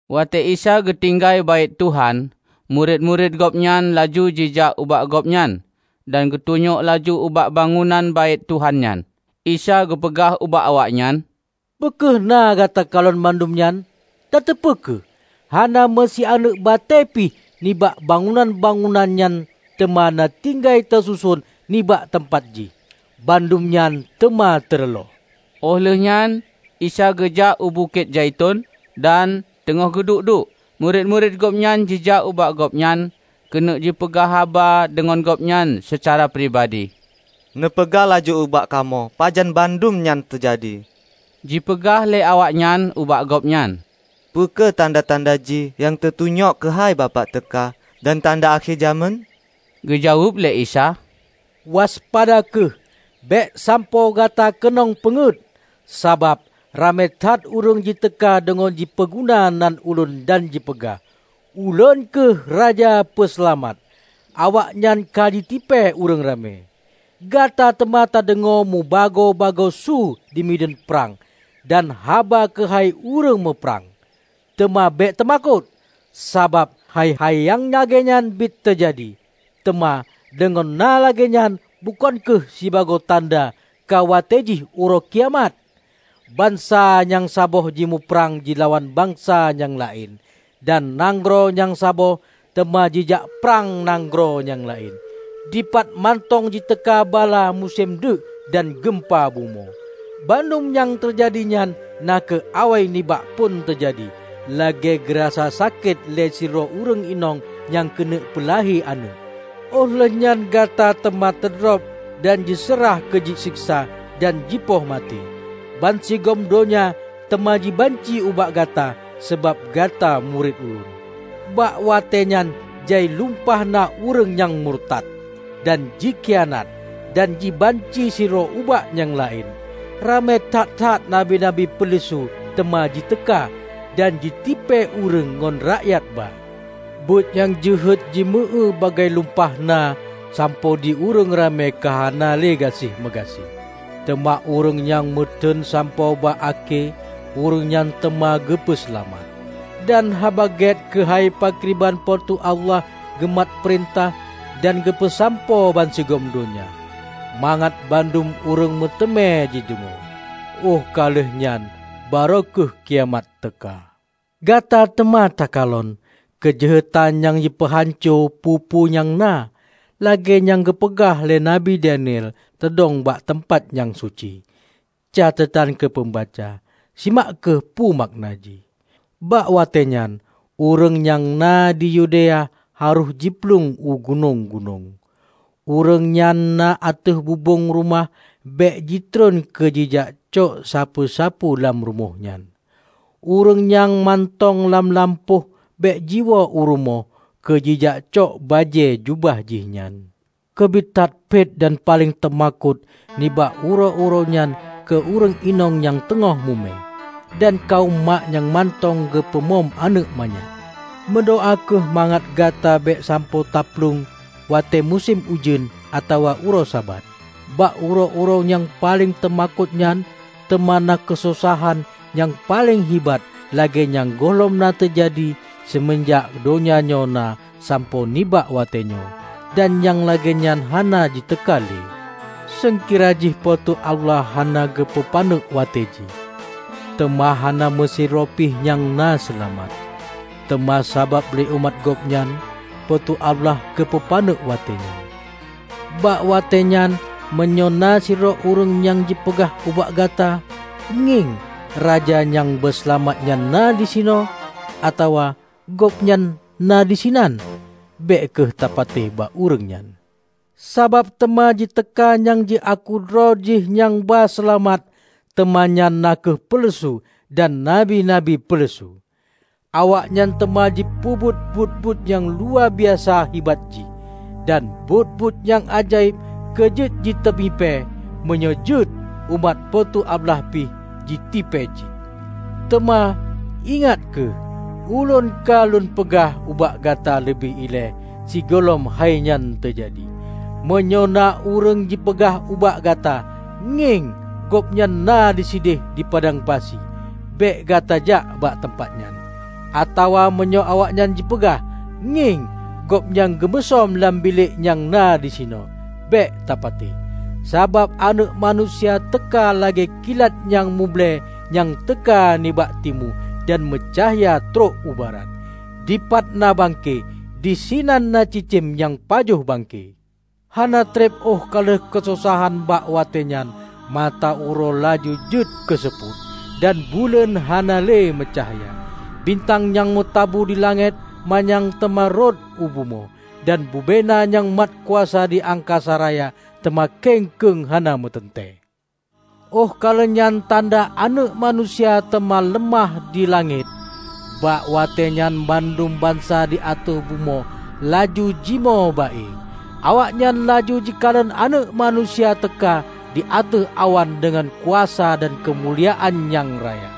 Watée Isa geutinggai Baét Tuhan, murit-murit Gobnyan laju jijak ubak Gobnyan dan geutunyok laju ubak bangunan Baét Tuhan nyan. Isa geupeugah ubak awaknyan, "Peu kheueh na gata kalon bandum nyan? Tateupeue kheueh, hana meu sianeuëk batée pih nibak bangunan-bangunan nyan teuma na tinggai teususon nibak teumpat jih. Bandum nyan teuma teureuloh." Óh lheueh nyan Isa geujak u Bukét Zaiton, dan teungoh geuduek-duek, murit-murit Gobnyan jijak ubak Gobnyan keuneuk jipeugah haba deungon Gobnyan seucara pribadi. "Neupeugah laju ubak kamoe pajan bandum nyan teujadi," jipeugah lé awaknyan ubak Gobnyan. "Peu kheueh tanda-tanda jih nyang teutunyok keuhai Bapak teuka dan tanda akhé jamén?" Geujaweueb lé Isa, "Waspada kheueh, bék sampoe gata keunong peungeuet. Sabab ramé that ureuëng jiteuka deungon jipeuguna nan Ulôn dan jipeugah, 'Ulôn kheueh Raja Peuseulamat!' Awaknyan ka jitipée ureuëng ramé. Gata teuma tadeungoe meubagoe-bagoe su di mideuen prang dan haba keuhai ureuëng muprang, teuma bék teumakot. Sabab hai-hai nyang lagée nyan bit teujadi, teuma deungon na lagée nyan bukon kheueh sibagoe tanda ka watée jih uroe kiamat. Bansa nyang saboh jimuprang jilawan bansa nyang laén, dan nanggroe nyang saboh teuma jijak prang nanggroe nyang laén. Dipat mantong jiteuka bala musém deuek dan geumpa bumoe. Bandum nyang teujadi nyan na kheueh awai nibak phon teujadi, lagée geurasa sakét lé sidroe ureuëng inong nyang keuneuk peulahé aneuëk. Óh lheueh nyan gata teuma teudrob dan jiseurah keu jiseksa dan jipoh maté. Bansigom donya teuma jibanci ubak gata sabab gata murit Ulôn. Bak watée nyan jai lumpah na ureuëng nyang murtat, dan jikhianat dan jibanci sidroe ubak nyang laén. Ramé that-that nabi-nabi peuleusu teuma jiteuka, dan jitipée ureuëng ngon rakyat ba. Buet nyang jeuhet jimeu-éue bagaih lumpah na sampoe di ureuëng ramé ka hana le gaséh meugaséh. Teuma ureuëng nyang meuteuen sampoe bak akhé, ureuëng nyan teuma geupeu seulamat. Dan Haba Gét keuhai pakriban Po teu Allah geumat peurintah dan geupeusampoe bansigom donya, mangat bandum ureuëng meuteumé jideungoe. Óh ka lheueh nyan barô kheueh kiamat teuka." "Gata teuma takalon 'Keujeuhetan nyang jipeuhanco peue-peue nyang na', lagée nyang geupeugah lé Nabi Daniel, teudong bak teumpat nyang suci. (Catetan keu peumbaca: Simak kheueh peue makna jih!) Bak watéenyan, ureuëng nyang na di Yudea harôh jiplueng u gunong-gunong. Ureuëng nyan na ateueh bubong rumoh bék jitron keu jijak cok sapeue-sapeue lam rumoh nyan. Ureuëng nyang mantong lam lampôh bék jiwoe u rumoh keu jijak cok bajée jubah jihnyan. Keubiet that phet dan paleng teumakot nibak uroe-uroe nyan keu ureuëng inong nyang teungoh mume, dan kawöm mak nyang mantong geupeu mom aneuëk manyak! Meudoá kheueh mangat gata bék sampoe taplueng watée musém ujeuen atawa uroe Sabat! Bak uroe-uroe nyang paleng teumakot nyan teuma na keusosahan nyang paleng hibat lagée nyang gohlom na teujadi seumeunjak donya nyoe na sampoe nibak watée nyoe, dan nyang lagée nyan hana jiteuka lé. Seungkira jih Po teu Allah hana geupeu paneuk watée jih; teuma hana meusidroe pih nyang na seulamat. Teuma sabab lé umat Gobnyan, Po teu Allah geupeu paneuk watée nyan. Bak watée nyan meunyoe na sidroe ureuëng nyang jipeugah ubak gata, 'Ngieng, Raja nyang ba seulamat nyan na disinoe!' atawa, 'Gobnyan na disinan!' -- bék kheueh tapatéh bak ureuëng nyan. Sabab teuma jiteuka nyang jiaku droe jih nyang ba seulamat teuma nyan na kheueh peuleusu dan nabi-nabi peuleusu. Awaknyan teuma jipeubuet buet-buet nyang luwa biasa hibat jih, dan buet-buet nyang ajaéb keu jeuet jiteumipée, meunyoe jeuet, umat Po teu Allah pih jitipée cit. Teuma, ingat kheueh! Ulôn ka Lôn peugah ubak gata leubeh ilée sigohlom hai nyan teujadi. Meunyoe na ureuëng jipeugah ubak gata, 'Ngieng, Gobnyan na di sideh dipadang pasi!' -- bék gata jak bak teumpat nyan. Atawa meunyoe awaknyan jipeugah, 'Ngieng, Gobnyan geumusöm lam bilék nyang na disinoe!' -- bék tapatéh. Sabab Aneuëk Manusia teuka lagée kilat nyang muble nyang teuka nibak timu, dan meucahya trok u barat. Dipat na bangke, disinan na cicém nyang pajoh bangke!" "Hana treb óh ka lheueh keusosahan bak watée nyan, mata uroe laju jeuet keu seupôt, dan buleuen hana le meucahya. Bintang nyang meutabu di langét manyang teuma rhot u bumoe, dan bubena nyang mat kuasa di angkasa raya teuma keng keueng hana meuteuntée. Óh ka lheueh nyan tanda Aneuëk Manusia teuma leumah di langét. Bak watée nyan bandum bansa di ateueh bumoe laju jimoe ba-e. Awaknyan laju jikalon Aneuëk Manusia teuka di ateueh awan deungon kuasa dan keumuliaan nyang raya.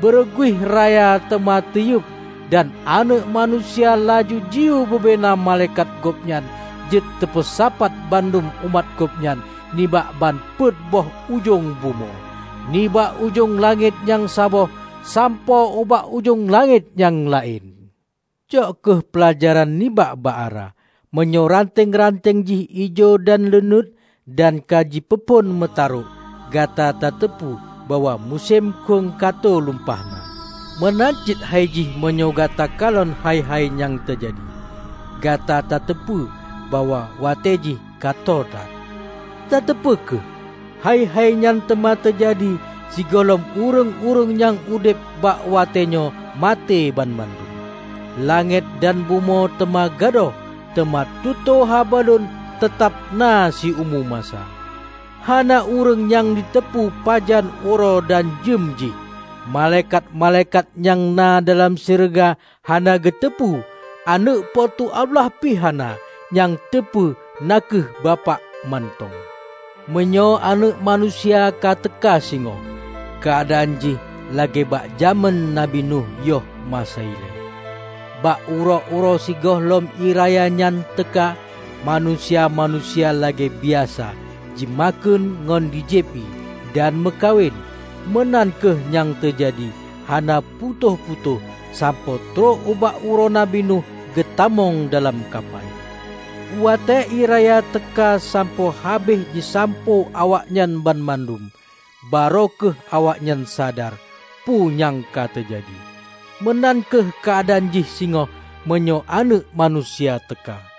Beureuguih raya teuma teuyueb, dan Aneuëk Manusia laju jiyue bubena malaikat Gobnyan jeuet teupeusapat bandum umat Gobnyan nibak ban peuet boh ujong bumoe, nibak ujong langét nyang saboh sampoe ubak ujong langét nyang laén." "Cok kheueh peulajaran nibak bak ara. Meunyoe ranteng-ranteng jih ijo dan leunuet, dan ka jipeuphon meutarôk, gata tateupeue bahwa musém khueng ka tho lumpah na. Meunan cit hai jih meunyoe gata kalon hai-hai nyan teujadi, gata tateupeue bahwa watéejih ka tô that. Tateupeue kheueh! Hai-hai nyan teuma teujadi sigohlom ureuëng-ureuëng nyang udeb bak watée nyoe maté banmandum. Langét dan bumoe teuma gadôh, teuma tutoe haba Lôn teutab na siumu masa." "Hana ureuëng nyang jiteupeu pajan uroe dan jeuem jih, malaikat-malaikat nyang na dalam syeuruga hana geuteupeue, Aneuëk Po teu Allah pih hana, nyang teupeue na kheueh Bapak mantong. Meunyoe Aneuëk Manusia ka teuka singoh, keuadaan jih lagée bak jamén Nabi Nuh yoh masa ilée. Bak uroe-uroe sigohlom ié raya nyan teuka, manusia-manusia lagée biasa jimakheun ngon jijieb ié, dan meukawen. Meunan kheueh nyang teujadi hana putôh-putôh sampoe trok ubak uroe Nabi Nuh geutamong dalam kapai. Watée ié raya teuka sampoe habéh jisampôh awaknyan banmandum, barô kheueh awaknyan sadar peue nyang ka teujadi. Meunan kheueh keuadaan jih singoh meunyoe Aneuëk Manusia teuka.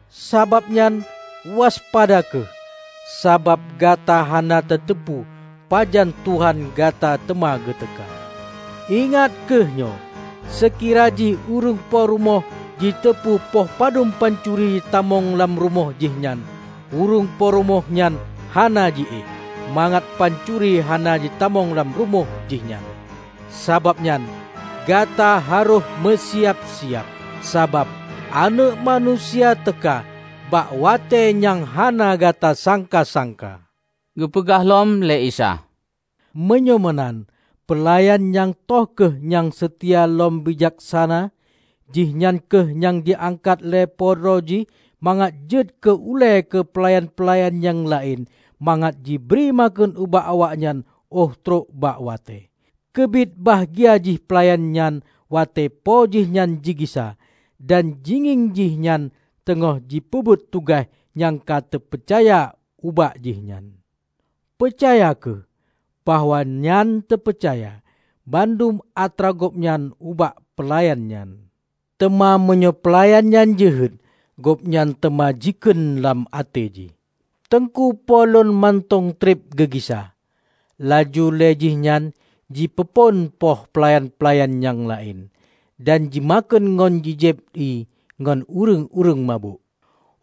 Sabab nyan, waspada kheueh, sabab gata hana tateupeue pajan Tuhan gata teuma geuteuka. Ingat kheueh nyoe! Seukira jih ureuëng po rumoh jiteupeu poh padub pancuri jitamong lam rumoh jihnyan, ureuëng po rumoh nyan hana jiéh, mangat pancuri hana jitamong lam rumoh jihnyan. Sabab nyan, gata harôh meusiab-siab. Sabab Aneuëk Manusia teuka bak watée nyang hana gata sangka-sangka." Geupeugah lom lé Isa, "Meunyoe meunan, peulayan nyang toh kheueh nyang seutia lom bijaksana? Jihnyan kheueh nyang ji-angkat lé po droe jih mangat jeuet keu ulée keu peulayan-peulayan nyang laén, mangat jibri makheun ubak awaknyan óh trok bak watée. Keubiet bahgia jih peulayan nyan watée po jihnyan jigisa, dan jingieng jih nyan teungoh jipeubuet tugaih nyang ka teupeucaya ubak jihnyan. Peucaya kheueh, bahwa nyan teupeucaya bandum atra gobnyan ubak peulayan nyan. Teuma meunyoe peulayan nyan jeuhet, gobnyan teuma jikheun lam até jih, 'Teungku po lôn mantong treb geugisa,' laju lé jihnyan jipeuphon poh peulayan-peulayan nyang laén, dan jimakheun ngon ji-jieb ié ngon ureuëng-ureuëng mabök.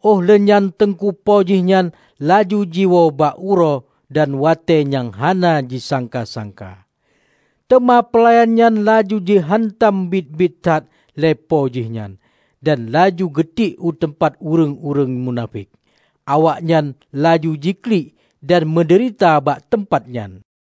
Óh lheueh nyan teungku po jihnyan laju jiwoe bak uroe dan watée nyang hana jisangka-sangka. Teuma peulayan nyan laju jiheuntam bit-bit that lé po jihnyan, dan laju geutiek u teumpat ureuëng-ureuëng munafék. Awaknyan laju jiklik dan meudeurita bak teumpat nyan."